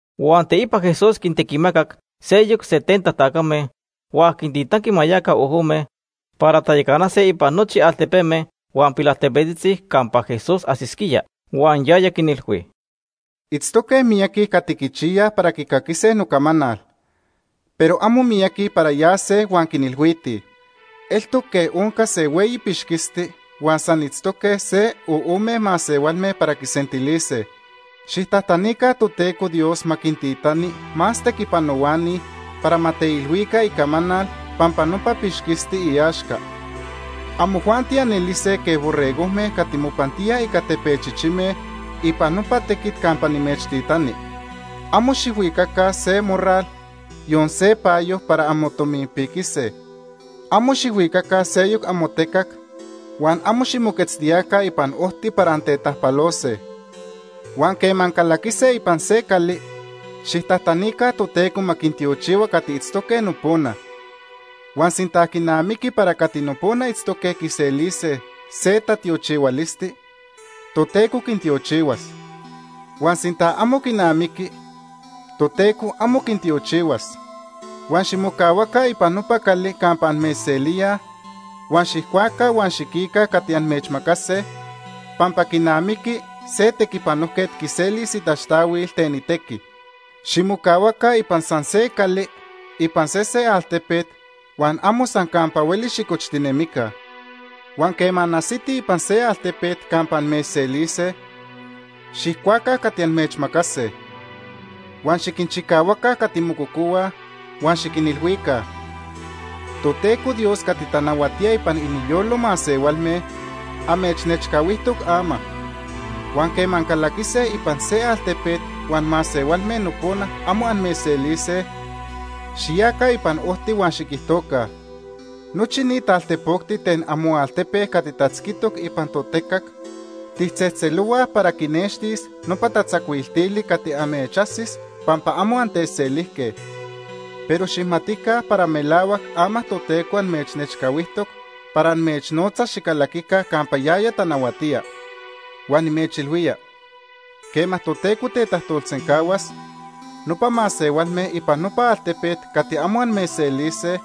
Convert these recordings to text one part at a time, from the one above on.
Huan teipa Jesús quintequimacac seyoc setenta tacame huan quintitanqui ma yaca ojome para tayacanase ipan nochi altepeme huan pilaltepetzitzi campa Jesús ajsisquía. Huan yaya quinilhui: “Itztoque miyaqui cati quichiyaj para quicaquise nocamanal, pero amo miyaqui para yase huan quinilhuitij. Eltoc quej onca se hueyi pixquisti huan san itztoque se o ome masehualme para quisentilise. Xijtajtanica Toteco Dios ma quintitani más tequipanohuani para ma teilhuica icamanal pampa nopa pixquisti iaxca. Amojuanti anelise quej borregojme cati mopantíaj ica tepechichime ipan nopa tequit campa nimechtitani. Amo xijhuicaca se morral, yon se payo para anmotominpiquise. Amo xijhuicaca seyoc amotecac huan amo ximoquetztiyaca ipan ojti para antetajpalose. Huan quema ancalaquise ipan se cali, xijtajtanica Toteco ma quintiochihua cati itztoque nopona. Huan sinta quinamiqui para cati nopona itztoque quiselise se tatiochihualisti, Toteco quintiochihuas. Huan sinta amo quinamiqui, Toteco amo quintiochihuas. Huan ximocahuaca ipan nopa cali campa amechselíaj, huan xijcuaca huan xiquica cati amechmacase pampa quinamiqui se tequipanojquet quiselis itaxtahuil ten itequi. Ximocahuaca ipan san se cali ipan sese altepet, huan amo san campa hueli xicochtinemica. Huan quema anajsitij ipan se altepet campa amechselise, xijcuaca cati amechmacase. Huan xiquinchicahuaca cati mococohuaj huan xiquinilhuica: ‘Toteco Dios cati tanahuatía ipan iniyolo masehualme amechnechcahuijtoc ama.’ Huan quema ancalaquise ipan se altepet huan masehualme nopona amo amechselise, xiyaca ipan ojti huan xiquijtoca: ‘Nochi ni taltepocti ten amoaltepe cati tatzquitoc ipan totecac tijtzejtzelohuaj para quinextis nopa tatzacuiltili cati amechajsis pampa amo antechselijque. Pero xijmatica para melahuac ama Toteco amechnechcahuijtoc para amechnotzas xicalaquica campa yaya tanahuatía.’ Huan nimechilhuía, quema Toteco tetajtolsencahuas, nopa masehualme ipan nopa altepet cati amo amechselise,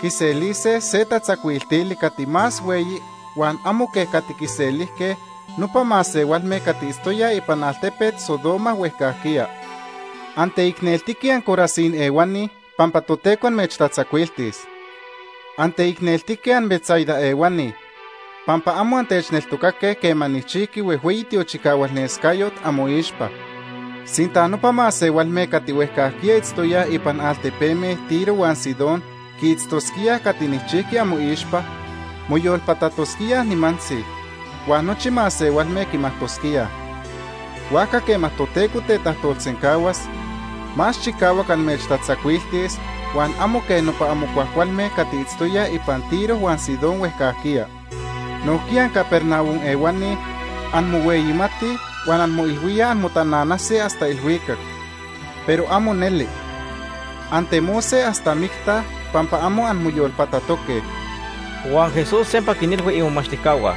quiselise se tatzacuiltili cati más hueyi huan amo quej cati quiselijque nopa masehualme cati itztoyaj ipan altepet Sodoma huejcajquiya. “Anteicneltique anCorazín ehuani pampa Toteco amechtatzacuiltis. Anteicneltique anBetsaida ehuani, pampa amo antechneltocaque quema nijchijqui huejhueyi tiochicahualnescayot amoixpa. Sinta nopa masehualme cati huejcajquiya itztoyaj ipan altepeme Tiro huan Sidón quiitztosquíaj cati nijchijqui amoixpa, moyolpatatosquíaj nimantzi, huan nochi masehualme quimajtosquíaj. Huajca quema Toteco tetajtolsencahuas, más chicahuac amechtatzacuiltis huan amo quej nopa amo cuajcualme cati itztoyaj ipan Tiro huan Sidón huejcajquiya. Nojquiya anCapernaum ehuani anmohueyimatij huan anmoilhuíaj anmotananase hasta ilhuicac, pero amo neli. Antemose hasta micta pampa amo anmoyolpatatoque.” Huan Jesús sempa quinilhui imomachtijcahua: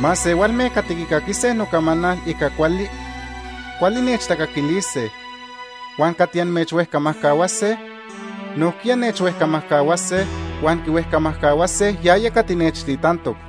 “Masehualme cati quicaquise amocamanal ica cuali, cuali nechtacaquilise, huan cati amechhuejcamajcahuase, nojquiya nechhuejcamajcahuase huan quihuejcamajcahuase yaya cati nechtitantoc.”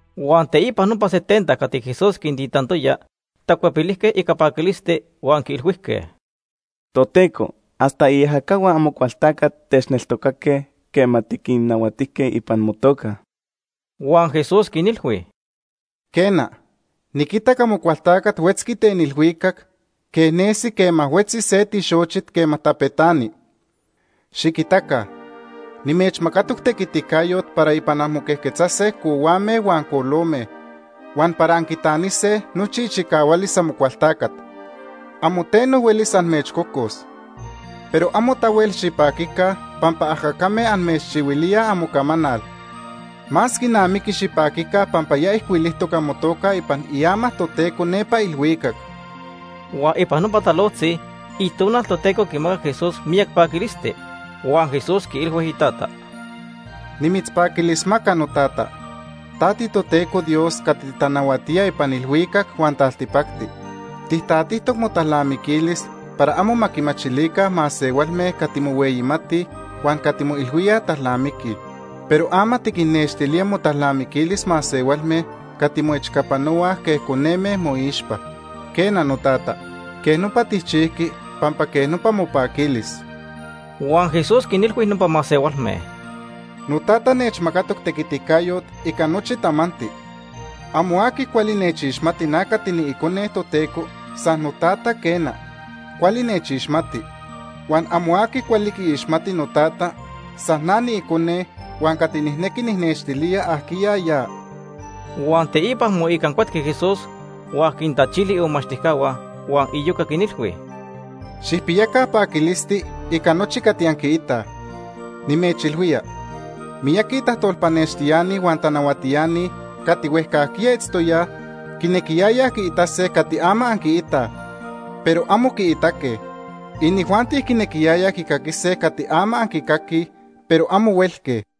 Huan teipa nopa setenta cati Jesús quintitantoya tacuepilijque ica paquilisti huan quiilhuijque: ―Toteco, hasta iajacahua Amocualtacat techneltocaque quema tiquinnahuatijque ipan motoca Ica motequiticayo.. Huan Jesús quinilhui: ―Quena, niquitac Amocualtacat huetzqui ten ilhuicac quej nesi quema huetzi se tixochit quema tapetani. Xiquitaca, nimechmacatoc tequiticayot para ipan anmoquejquetzase cohuame huan colome, huan para anquitanise nochi ichicahualis Amocualtacat. Amo teno huelis amechcocos. Pero amo tahuel xipaquica pampa ajacame amechchihuilíaj amocamanal. Más quinamiqui xipaquica pampa ya ijcuilijtoc amotoca ipan iama Toteco nepa ilhuicac. Huan ipan nopa talojtzi Itonal Toteco quimacac Jesús miyac paquilisti huan Jesús quiilhui iTata: “Nimitzpaquilismaca, noTata, ta tiToteco Dios cati titanahuatía ipan ilhuicac huan taltipacti. Tijtatijtoc motalnamiquilis para amo ma quimachilica masehualme cati mohueyimatij huan cati moilhuíaj talnamiquij. Pero ama tiquinnextilía motalnamiquilis masehualme cati moechcapanohuaj quej coneme moixpa. Quena, Notata, quej nopa tijchijqui pampa quej nopa mopaquilis.” Huan Jesús quinilhui nopa masehualme: “NoTata nechmacatoc tequiticayot ica nochi tamanti. Amo aqui cuali nechixmati na cati niIcone Toteco, san noTata, quena, cuali nechixmati. Huan amo aqui cuali quiixmati noTata, san na niIcone huan cati nijnequi nijnextilía ajquiya ya.” Huan teipa moicancuetqui Jesús huan quintachili imomachtijcahua huan iyoca quinilhui: “Xijpiyaca paquilisti ica nochi cati anquiitaj. Nimechilhuía, miyaqui tajtolpanextiani huan tanahuatiani cati huejcajquiya itztoyaj quinejque quiitase cati ama anquiitaj, pero amo quiitaque. Inijuanti quinequiyayaj quicaquise cati ama anquicaquij, pero amo huelque.”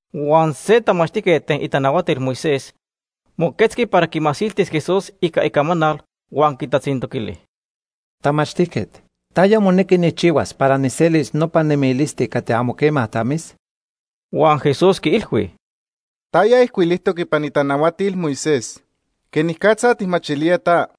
Huan se tamachtijquet ten itanahuatil Moisés moquetzqui para quimasiltis Jesús ica icamanal huan quitatzintoquili: ―Tamachtijquet, ¿taya monequi nijchihuas para nijselis nopa nemilisti cati amo quema tamis? Huan Jesús quiilhui: ―¿Taya ijcuilijtoc ipan itanahuatil Moisés? ¿Quenicatza tijmachilía ta?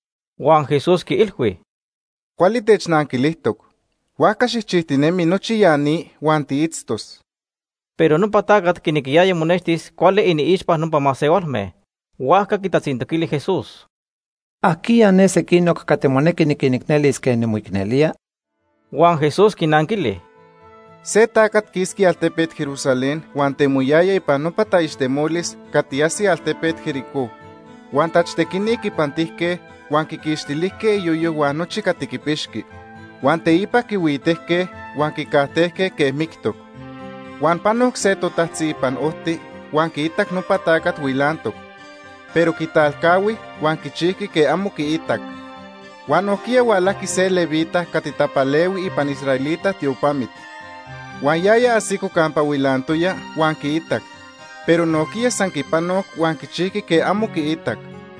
Huan Jesús quiilhui: ―Cuali technanquilijtoc. Huajca xijchijtinemi nochi ya ni huan tiitztos. Pero nopa tacat quinequiyaya monextis cuali iniixpa nopa masehualme, huajca quitatzintoquili Jesús: ―¿Ajquiya ne sequinoc cati monequi niquinicnelis quej nimoicnelía? Huan Jesús quinanquili: ―Se tacat quisqui altepet Jerusalén huan temoyaya ipan nopa taixtemolis cati ajsi altepet Jericó. Huan tachtequini quipantijque, huan quiquixtilijque iyoyo huan nochi cati quipixqui. Huan teipa quihuitejque huan quicajtejque quej mictoc. Huan panoc se totajtzi ipan ojti huan quiitac nopa tacat huilantoc, pero quitalcahui huan quichijqui quej amo quiitac. Huan nojquiya hualajqui se levita cati tapalehui ipan israelita tiopamit. Huan yaya ajsico campa huilantoya huan quiitac, pero nojquiya san quipanoc huan quichijqui quej amo quiitac.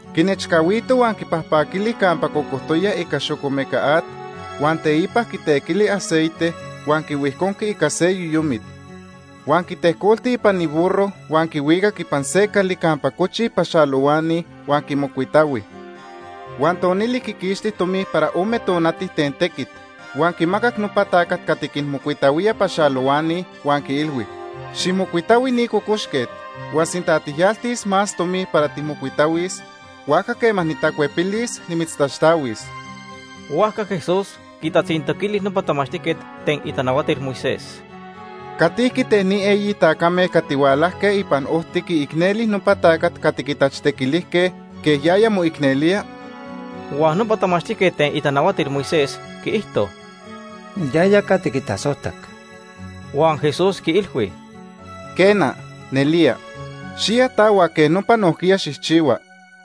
Quinechcahuito huan quipajpaquili campa cocojtoya ica xocomeca at, huan teipa quitequili aceite, huan quihuijconqui ica se yoyomit. Huan quitejcolti ipan iburro huan quihuicac ipan se cali campa cochij paxalohuani huan quimocuitahui. Huan tonili quiquixti tomi para ome tonati ten tequit, huan quimacac nopa tacat cati quinmocuitahuía paxalohuani huan quiilhui: ‘Xijmocuitahui ni cocoxquet huan sinta tijyaltis más tomi para tijmocuitahuis, huajca quema nitacuepilis, nimitztaxtahuis.’ Huajca Jesús quitatzintoquili nopa tamachtijquet ten itanahuatil Moisés: ―¿Catijqui ten ni eyi tacame cati hualajque ipan ojti quiicneli nopa tacat cati quitachtequilijque quej yaya moicnelía? Huan nopa tamachtijquet ten itanahuatil Moisés quiijto: ―Yaya cati quitasojtac. Huan Jesús quiilhui: ―Quena, nelía. Xiya ta huan quej nopa nojquiya xijchihua.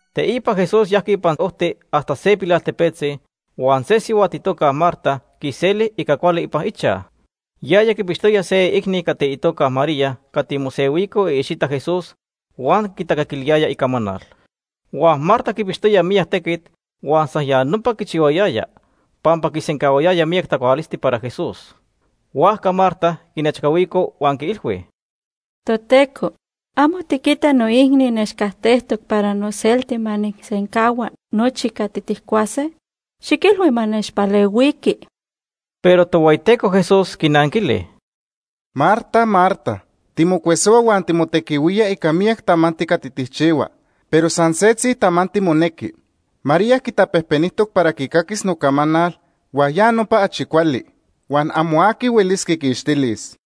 Teipa Jesús yajqui ipan ojti hasta se pilaltepetzi, huan se sihuat itoca Marta quiseli ica cuali ipan ichaj. Yaya quipixtoya se iicni cati itoca María cati mosehuico iicxita Jesús huan quitacaquiliyaya icamanal. Huan Marta quipixtoya miyac tequit huan san ya nopa quichihuayaya, pampa quisencahuayaya miyac tacualisti para Jesús. Huajca Marta quinechcahuico huan quiilhui: ―Toteco, ¿amo tiquita noicni nechcajtejtoc para noselti ma nijsencahua nochi cati tijcuase? Xiquilhui ma nechpalehuiqui. Pero Tohueyiteco Jesús quinanquili: ―Marta, Marta, timocuesohua huan timotequihuía ica miyac tamanti cati tijchihua, pero san setzi tamanti monequi. María quitapejpenijtoc para quicaquis nocamanal, huan ya nopa achi cuali, huan amo aqui huelis quiquixtilis.